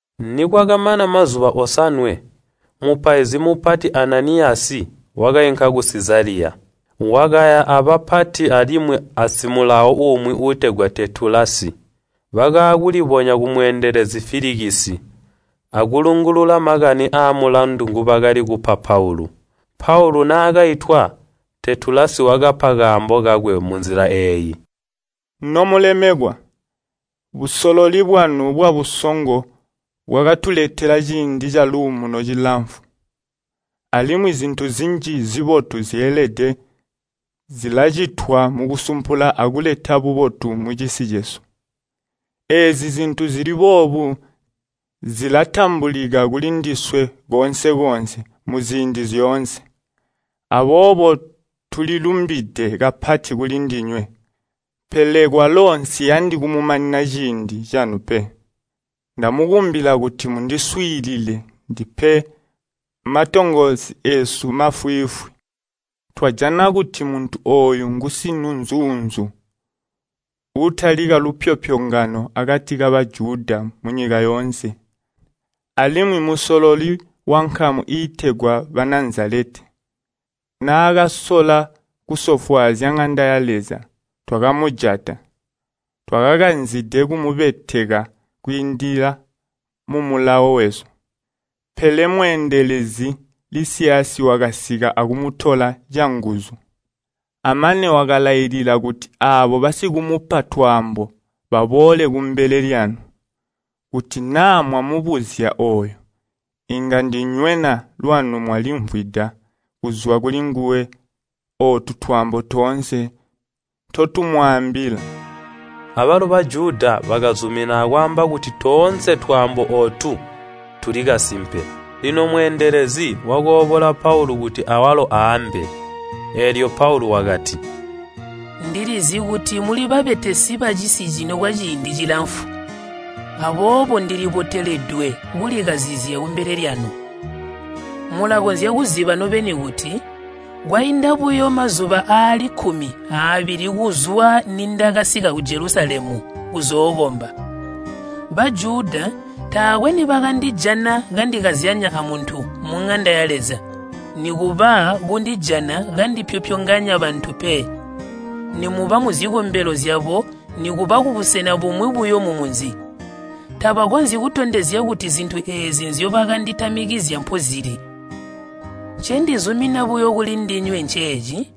Nikwakamana mazuba osanwe, mupaizi mupati Ananiyasi wakainka ku Sizaliya, wakaya abapati alimwi asimulawo umwi uutegwa Teetulasi. Bakaakulibonya kumweendelezi Filikisi, akulungulula makani aamulandu ngobakali kupa Paulu. Paulu naakaitwa, Teetulasi wakapa kaambo kakwe munzila eeyi, “Nomulemekwa! Busololi bwanu bwabusongo bwakatuletela ciindi caluumuno cilamfu, alimwi zintu zinji zibotu zyeelede zilacitwa mukusumpula akuleta bubotu mucisi cesu. Eezi zintu zili boobu zilatambulika kulindiswe koonse-koonse muziindi zyoonse. Aboobo tulilumbide kapati kulindinywe. Pele kwalo nsiyandi kumumanina ciindi canu pe, ndamukumbila kuti mundiswiilile ndipe matongoosi eesu mafwiifwi. Twajana kuti muntu ooyu ngusiŋunzuunzu. Utalika lupyopyongano akati ka Bajuda munyika yoonse, alimwi mmusololi wankamu iitegwa Banazaleti. Naakasola kusofwaazya ŋanda ya Leza, twakumujata. [Twakakanzide kumubeteka kwiindila mumulawo wesu, pele mweendelezi Lisiyasi wakasika akumutola canguzu. Amane wakalailila kuti aabo basikumupa twaambo baboole kumbele lyanu.] Kuti naa mwamubuzya ooyu, inga ndinywena lwanu mwalimvwida kuzwa kulinguwe ootu twaambo toonse ntotumwaambila.” Abalo Bajuda bakazumina akwaamba kuti toonse twaambo ootu tuli kasimpe. Lino mweendelezi wakoobola Paulu kuti awalo aambe. Eelyo Paulu wakati, “Ndilizi kuti muli babetesi bacisi cino kwaciindi cilamfu, aboobo ndiliboteledwe kulikazizya kumbele lyanu. Mulakonzya kuziba nobeni kuti, kwainda buyo mazuba aali kkumi aabili kuzwa nindakasika ku Jelusalemu kuzookomba. Bajuda taakwe nibakandijana kandikazyanya amuntu muŋanda ya Leza, nikuba kundijana kandipyopyonganya bantu pe, nimuba muzikombelo zyabo nikuba kubusena bumwi buyo mumunzi. Tabakonzyi kutondezya kuti zintu eezi nzyobanditamikizya mpozili. Ncendizumina buyo kulindinywe nceeci,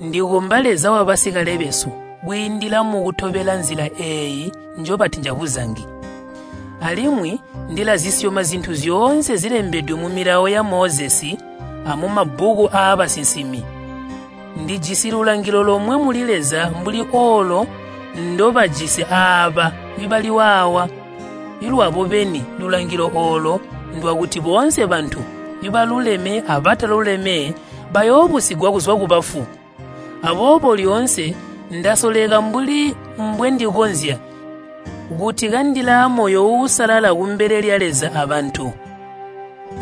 ndikomba Leza wabasikale besu kwiindila mukutobela Nzila eeyo njobati njabuzangi. Alimwi ndilazisyoma zintu zyoonse zilembedwe mu Milawo ya Mozesi amumabbuku aabasinsimi. Ndijisi lulangilo lomwe muli Leza mbuli oolo ndobajisi aaba bali waawa lwabo beni lulangilo oolo ndwakuti boonse bantu, baluleme abataluleme, bayoobusigwa kuzwa kubafu. Aboobo lyoonse ndasoleka mbuli mbwendikonzya, kuti kandilaamoyo uusalala kumbele lya Leza abantu.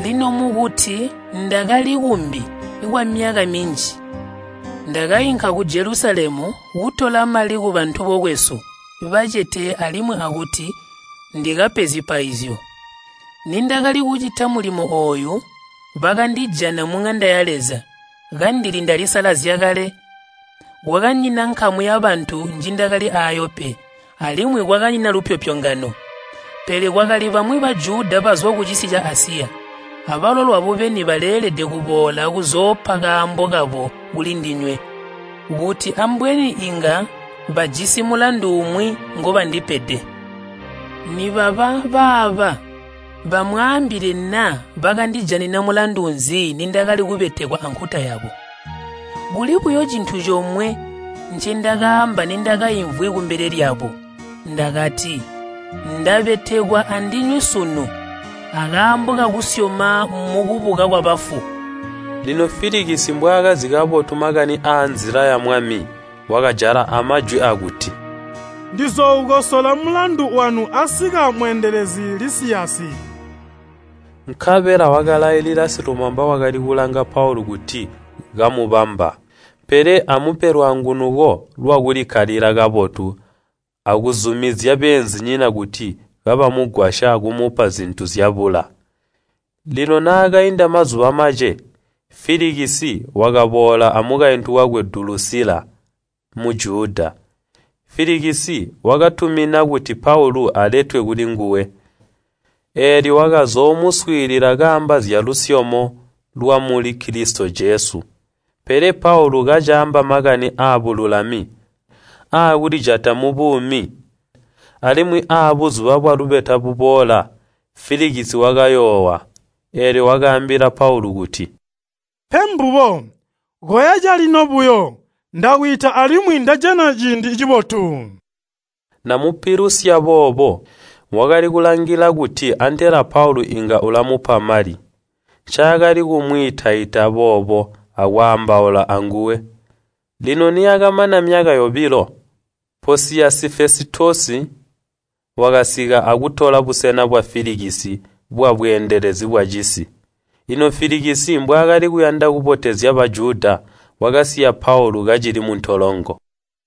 “Lino mukuti ndakali kumbi kwamyaka minji ndakainka ku Jelusalemu kutola mali kubantu bokwesu bacete alimwi akuti ndikape zipaizyo. Nindakali kucita mulimo ooyu, bakandijana muŋanda ya Leza, kandili ndalisalazya kale. Kwakanyina nkamu yabantu njindakali aayo pe, alimwi kwakanyina lupyopyongano. Pele kwakali bamwi Bajuda bazwa kucisi ca Asiya, abalo lwabo beni baleelede kuboola akuzoopa kaambo kabo kulindinywe, kuti ambweni inga bajisi mulandu umwi ngobandipede. Nibaba baaba bamwaambile naa bakandijanina mulandu nzi nindakali kubetekwa ankuta yabo. Kuli buyo cintu comwe ncindakaamba nindakaimvwi kumbele lyabo. Ndakati, ‘Ndabetekwa andinywe sunu akaambo kakusyoma mukubuka kwabafu!’” Lino Filikisi, mbwaakazi kabotu makani aa Nzila ya Mwami, wakajala amajwi aakuti, “Ndizooukosola mulandu wanu asika mweendelezi Lisiyasi.” Nkabela wakalailila silumamba wakali kulanga Paulu kuti kamubamba, pele amupe lwaangunuko lwakulikkalila kabotu akuzumizya beenzinyina kuti kabamugwasya kumupa zintu nzyabula. Lino naakainda mazuba mace, Filikisi wakaboola amukaintu wakwe Dulusila, Mujuda. Filikisi wakatumina kuti Paulu aletwe kulinguwe, eelyo wakazoomuswiilila kaamba zyalusyomo lwamuli Kilisito Jesu. Pele Paulu kacaamba makani aabululami, aakulijata mubuumi, alimwi aabuzuba bwalubeta buboola, Filikisi wakayoowa. Eelyo wakaambila Paulu kuti, “Pe mbubo, koya calino buyo, ndakwiita alimwi ndajana ciindi cibotu.” Namupilusya boobo wakali kulangila kuti antela Paulu inga ulamupa mali, ncaakali kumwiita-ita boobo akwaambaula anguwe. Lino niyakamana myaka yobilo, Poosiyosi Fesitosi wakasika akutola busena bwa Filikisi bwabweendelezi bwacisi. Lino Filikisi mbwaakali kuyanda kubotezya Bajuda, wakasiya Paulu kacili muntolongo.